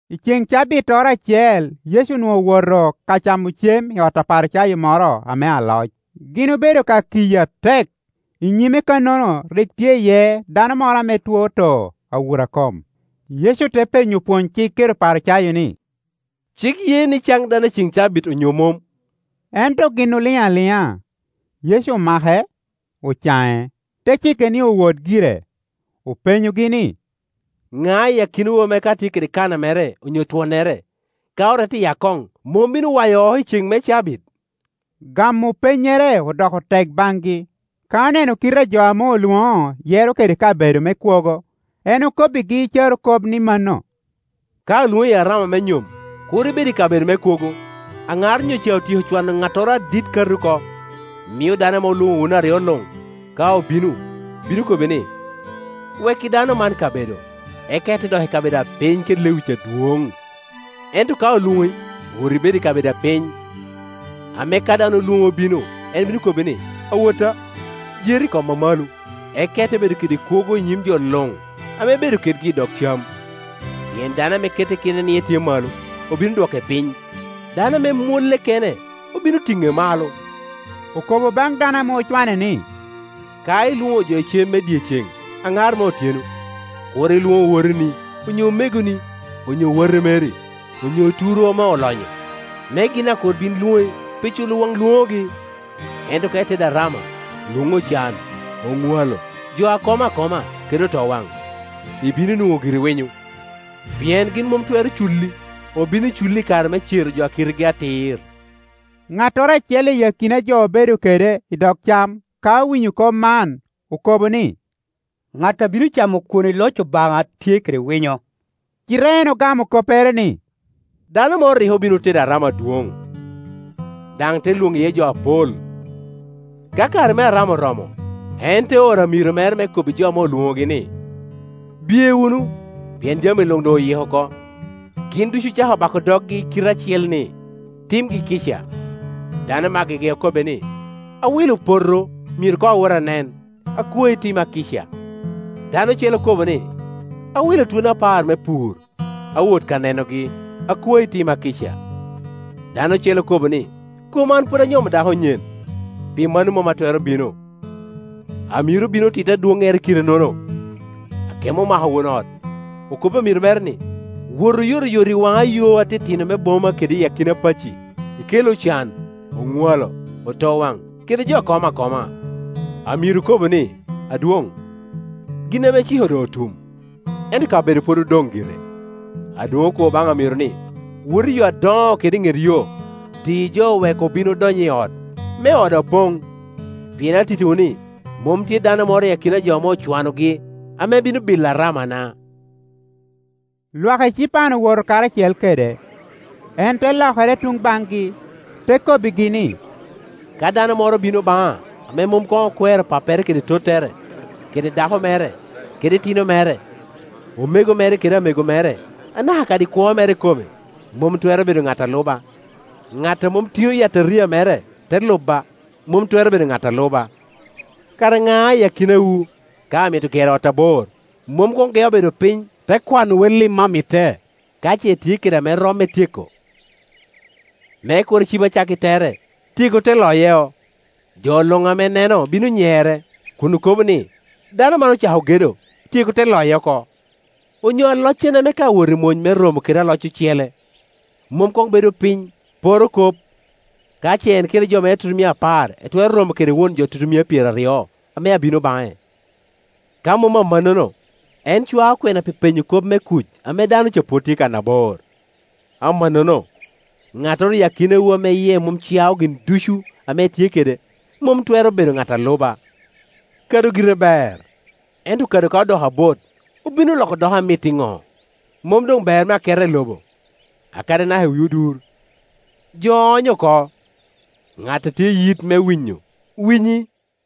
I ceŋ cabittoro acel Yecu onwoŋo owoto ka camo cem i ot Aparicayo moro ame aloc; gin obedo ka kiye atek. I nyime kannono rik tye iye dano moro ame two too awura-kom. Yecu te penyo opwonycik kede Oparicayo ni, “Cik ye ni can dano i cen cabit onyo mom?” Ento gin oliŋ aliŋa. Yecu omake, ocaŋe, te cike ni owot gire. Openyogi ni, “Ŋa i akinawu ame ka tye kede kana mere onyo twonnere, ka orette i akoŋ, mom bino wayo oko i ceŋ me cabit?” Gamo pennyere odoko tek baŋgi. Ka oneno kite a jo ame olwoŋo yero kede kabedo me kwogo, en okobbigi carokop ni mano, “Ka olwoŋi i arama me nyom, kur ibed i kabedo me kwogo; aŋar onyo ca otyeko cwano ŋattoro adit kati oko, mio dano ame olwoŋo wun aryo luŋ ka obino, bino kobbi ni, ‘Wekki dano man kabedo,’ eka ite dok i kabedo apiny kede lewic adwoŋ. Ento ka olwoŋi, wot ibed i kabedo apiny, ame ka dano olwoŋi obino, en bino kobbi ni, ‘Awotta, jer i kom amalo’; eka ite bedo kede kwogo i nyim jo luŋ ame ibedo kedgi i dog cam. Pien dano ame kette kene ni etye malo, obino dwoke piny, dano ame mwolle kene obino tiŋe malo,” Okobo baŋ dano ame ocwane ni, “Ka ilwoŋo jo i cem me dyeceŋ aŋar me otyeno, kur ilwoŋ owoteni, onyo omegoni, onyo wati meri, onyo oturwu ame olonyo, me gin daŋ kur bin lwoŋi pi culo waŋ lwoŋogi. Ento ka itedo arama, lwoŋ ocan, oŋwalo, jo a komo akoma, kede otowaŋ; ibino nwoŋo giri winyo, pien gin mom twero culi. Obino culi i kare me cero jo a kitegi atir.” Ŋattoro acel i akina a jo obedo kede i dog cam ka owinyo kop man, okobo ni, “Ŋat a bino camo kwon i loc Obaŋa tye kede winyo!” Cite en ogamo koppere ni, “Dano moro rik obin otedo arama adwoŋ, daŋ te lwoŋo iye jo apol. Ka kare me arama oromo, en te oro amiro mere me kobbi jo ame olwoŋogi ni, ‘Bye wunu, pien jami luŋ doŋ oyiko oko.’ Gin ducu ocako bako doggi i kite acel ni timgi kica. Dano me agege okobbe ni, ‘Awilo poto, myero koŋ awot, anen; akwai, tima kica.’ Dano ocele okobo ni, ‘Awilo twoni apar me pur, awot ka nenogi; akwai, tima kica.’ Dano ocele okobo ni, ‘Kom an pwod anyomo dako nyen, pi mano mom atwero bino.’ Amiro obino, otitti adwoŋere kitenono. Akemo omako won ot, okobbi amiro mere ni, ‘Wot oyotoyot i waŋa yo atitino me boma kede i akina pacci, ikel ocan, oŋwalo, otowaŋ kede jo a komo akoma,’ Amiro okobo ni, ‘Adwoŋ, gin ame iciko doŋ otum, ento kabedo pwod odoŋ gire.’ Adwoŋ okobo baŋ amiro ni, ‘Wot i yo adoŋo kede i ŋet yo, di jo wek obin odony i ot, me oda poŋ. Pien atittiwu ni, mom tye dano moro i akina jo ame ocwanogi ame bino bilo aramana.’” Lwak ecipan owoto karacel kede, en te lokere tuŋ baŋgi, te kobbigi ni, “Ka duno moro bino baŋa ame mom koŋ okwero pappere kede tottere, kede dako mere, kede itino mere, omego mere kede amego mere, anaka kadi kwo mere ikome, mom twero bedo ŋat a luba, ŋat a mom tiŋo yataria mere, te luba, mom twero bedo ŋat a luba. Kara ŋa i akinawu, ka amito gero ot abor, mom koŋ geo bedo piny, te kwano wellim a mitte, ka ce etye kede ame romme tyeko? Me kur ecib acakki tere, tyeko te loye, jo luŋ ame neno bino nyere, kun okobo ni, ‘Dano man ocako gedo, tyeko te loye oko.’ Onyo aloccene, ame ka awot i mony me romo kede aloc ocele, mom koŋ bedo piny, poro kop, ka ce en kede jo mere tutumia apar etwero romo kede won jo tutumia pyeraryo ame abino baŋe. Ka mom amannono, en cwao kwena pi penyo kop me kuc ame dano ca pwod tye kannabor. Amannono, ŋattoro iyi akinawu ame yie mom cao gin ducu ame etye kede, mom twero bedo ŋat a luba. “Kado gire ber: ento kado ka odoko abot, obino loko doko amit iŋo? Mom doŋ ber me aketa i lobo, kadi anaka i wi odur; jo onyo oko, ŋat a tye i yit me winyo, winyi!”